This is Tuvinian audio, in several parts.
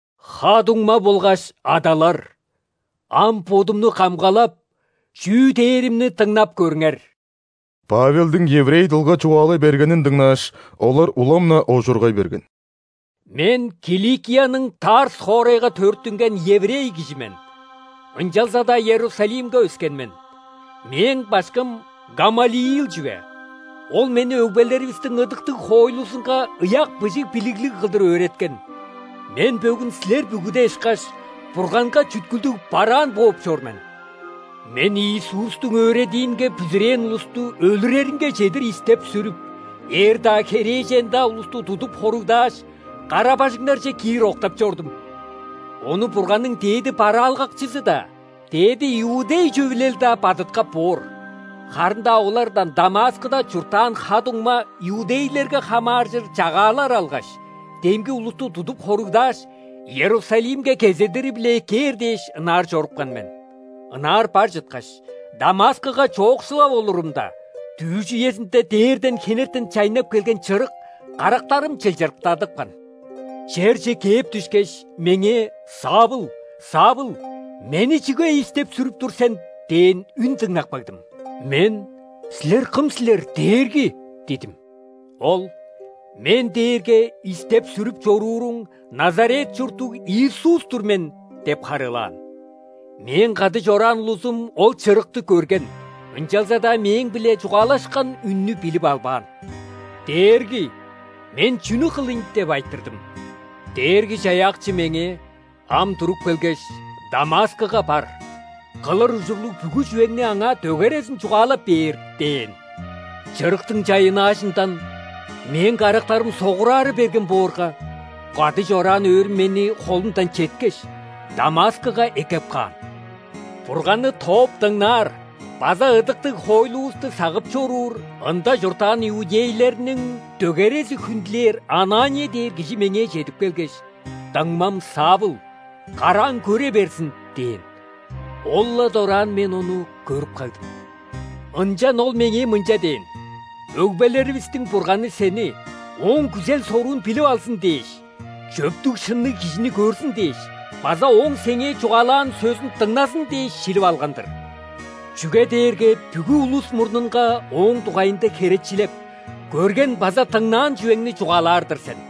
«Ха-дуңма болгаш адалар! Ам бодумну камгалап, чүү дээримни дыңнап көрүңер». Павелдиң еврей дылга чугаалай бергенин дыңнааш, олар улам-на оожургай берген. «Мен – Киликияның Тарс хоорайга төрүттүнген еврей кижи мен, ынчалза-даа Иерусалимге өскен мен. Мээң башкым Гамалиил чүве, ол мени өгбелеривистиң ыдыктыг хоойлузунга ыяк быжыг билиглиг кылдыр өөреткен. Мен, бөгүн силер бүгүде ышкаш, Бурганга чүткүлдүг бараан бооп чор мен. Мен Иисустуң өөредиинге бүзүрээн улусту өлүреринге чедир истеп-сүрүп, эр-даа, херээжен-даа улусту тудуп хоругдааш, кара-бажыңнарже киир октап чордум. Ону Бурганның дээди бараалгакчызы-даа, ·дээди иудей Чөвүлел-даа бадыткап боор. Харын-даа олардан Дамаскыда чурттаан ха-дуңма иудейлерге хамааржыр чагаалар алгаш, демги улусту тудуп хоругдааш, Иерусалимге кезедири-биле эккээр дээш, ынаар чорупкан мен. Ынаар бар чыткаш, Дамаскыга чоокшулап олурумда, дүъш үезинде дээрден хенертен чайнап келген чырык карактарым чылчырыктадыпкан. Черже кээп дүшкеш, меңээ: „Савл! Савл! Мени чүге истеп-сүрүп тур сен?“ – дээн үн дыңнап кагдым. Мен: „Силер кым силер, Дээрги?“ – дидим. Ол: „Мен дээрге истеп-сүрүп чорууруң Назарет чурттуг Иисус-тур мен“ – деп харыылаан. Мээң кады чораан улузум ол чырыкты көрген, ынчалза-даа мээң-биле чугаалашкан үннү билип албаан. „Дээрги, мен чүнү кылыйн?“ – деп айтырдым. Дээрги-Чаяакчы меңээ: „Ам туруп келгеш, Дамаскыга бар, кылыр ужурлуг бүгү чүвеңни аңаа дөгерезин чугаалап бээр“ – дээн. Чырыктың чайыннаажындан мээң карактарым согурара берген боорга, кады чораан өөрүм мени холумдан четкеш, Дамаскыга эккеп каан. Бурганны тооп дыңнаар база ыдыктыг хоойлувусту сагып чоруур, ында чурттаан иудейлерниң дөгерези хүндүлээр Анания дээр кижи меңээ чедип келгеш: „Дуңмам Савл, карааң көре берзин!“ – дээн. Ол-ла дораан мен ону көрүп кагдым. Ынчан ол меңээ мынча дээн: „Өгбелеривистиң Бурганы сени Ооң күзел-соруун билип алзын дээш, чөптүг-шынныг Кижини көрзүн дээш база Ооң сеңээ чугаалаан сөзүн дыңназын дээш шилип алган-дыр. Чүге дээрге бүгү улус мурнунга Ооң дугайында херечилеп, көрген база дыңнаан чүвеңни чугаалаар-дыр сен.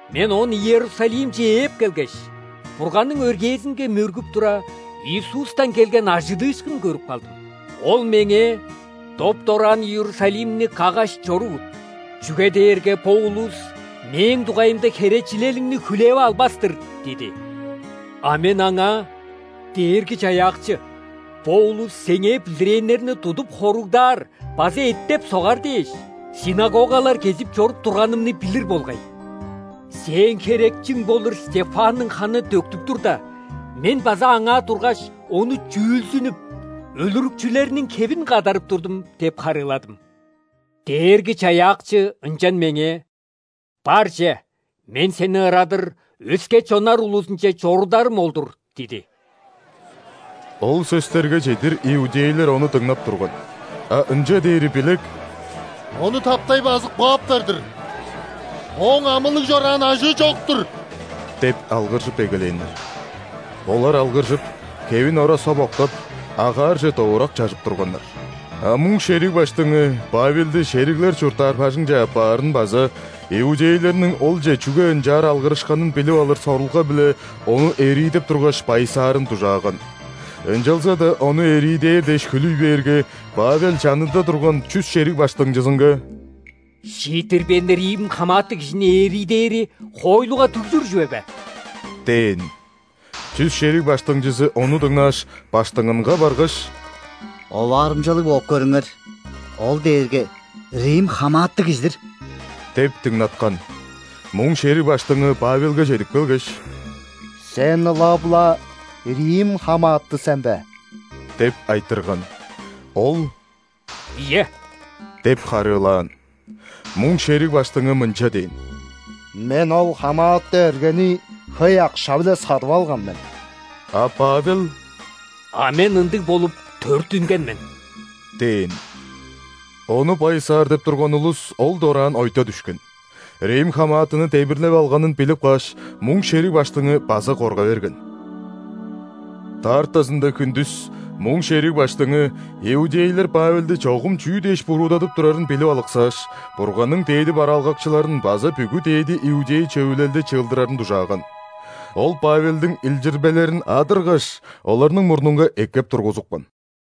Мен оон Иерусалимче ээп келгеш, Бурганның өргээзинге мөргүп тура, Иисустан келген ·ажыдыышкын көрүп кагдым. Ол меңээ: „Доп-дораан Иерусалимни каггаш чорувут, чүге дээрге бо улус Мээң дугайымда херечилелиңни хүлээп албас-тыр“ – диди. А мен Аңаа: „Дээрги-Чаяакчы, бо улус Сеңээ бүзүрээннерни тудуп хоругдаар база эттеп-согар дээш, ·синагогалар кезип чоруп турганымны билир болгай. Сээң херечиң болур Стефанның ханы төктүп турда, мен база аңаа тургаш, ону чүүлзүнүп, өлүрүкчүлерниң хевин кадарып турдум“ – деп харыыладым. Дээрги-Чаяакчы ынчан меңээ: „Бар че, Мен сени ырадыр, өске чоннар улузунче чорударым ол-дур“ – диди». Ол сөстерге чедир иудейлер ону дыңнап турган, а ынча дээри билек: «Ону таптай базып кааптар-дыр! Ооң амылыг чораан ажыы чок-тур!» – деп алгыржып эгелээннер. Олар алгыржып, хевин ора соп октап, агаарже довурак чажып турганнар. А муң шериг баштыңы Павелди шериглер чурттаар бажыңче аппаарын база иудейлерниң олче чүге ынчаар алгырышканын билип алыр сорулга-биле ону эриидеп тургаш, байысаарын дужааган. Ынчалза-даа ону эриидээр дээш хүлүй бээрге, Павел чанында турган чүс шериг баштыңчызынга: «Шииттирбээн рим хамааты кижини эриидээри хоойлуга дүгжүр чүве бе?» – дээн. Чүс шериг баштыңчызы ону дыңнааш, баштыңынга баргаш: «Оваарымчалыг бооп көрүңер. Ол дээрге рим хамааты кижи-дир» – деп дыңнаткан. Муң шериг баштыңы Павелге чедип келгеш: «Сен ылап-ла рим хамааты сен бе?» – деп айтырган. Ол: «Ийе» – деп харыылаан. Муң шериг баштыңы мынча дээн: «Мен ол хамааты эргени хөй акша-биле садып алган мен». А Павел: «А мен ындыг болуп төрүттүнген мен» – дээн. Ону байысаар деп турган улус ол дораан ойта дүшкен. Рим хамаатыны демирлеп алганын билип кааш, муң шериг баштыңы база корга берген. Даартазында хүндүс муң шериг баштыңы иудейлер Павелди чогум чүү дээш буруудадып турарын билип алыксааш, Бурганның дээди бараалгакчыларын база бүгү ·дээди иудей Чөвүлелди чыылдырарын дужааган. Ол Павелдиң илчирбелерин адыргаш, оларның мурнунга эккеп тургузупкан.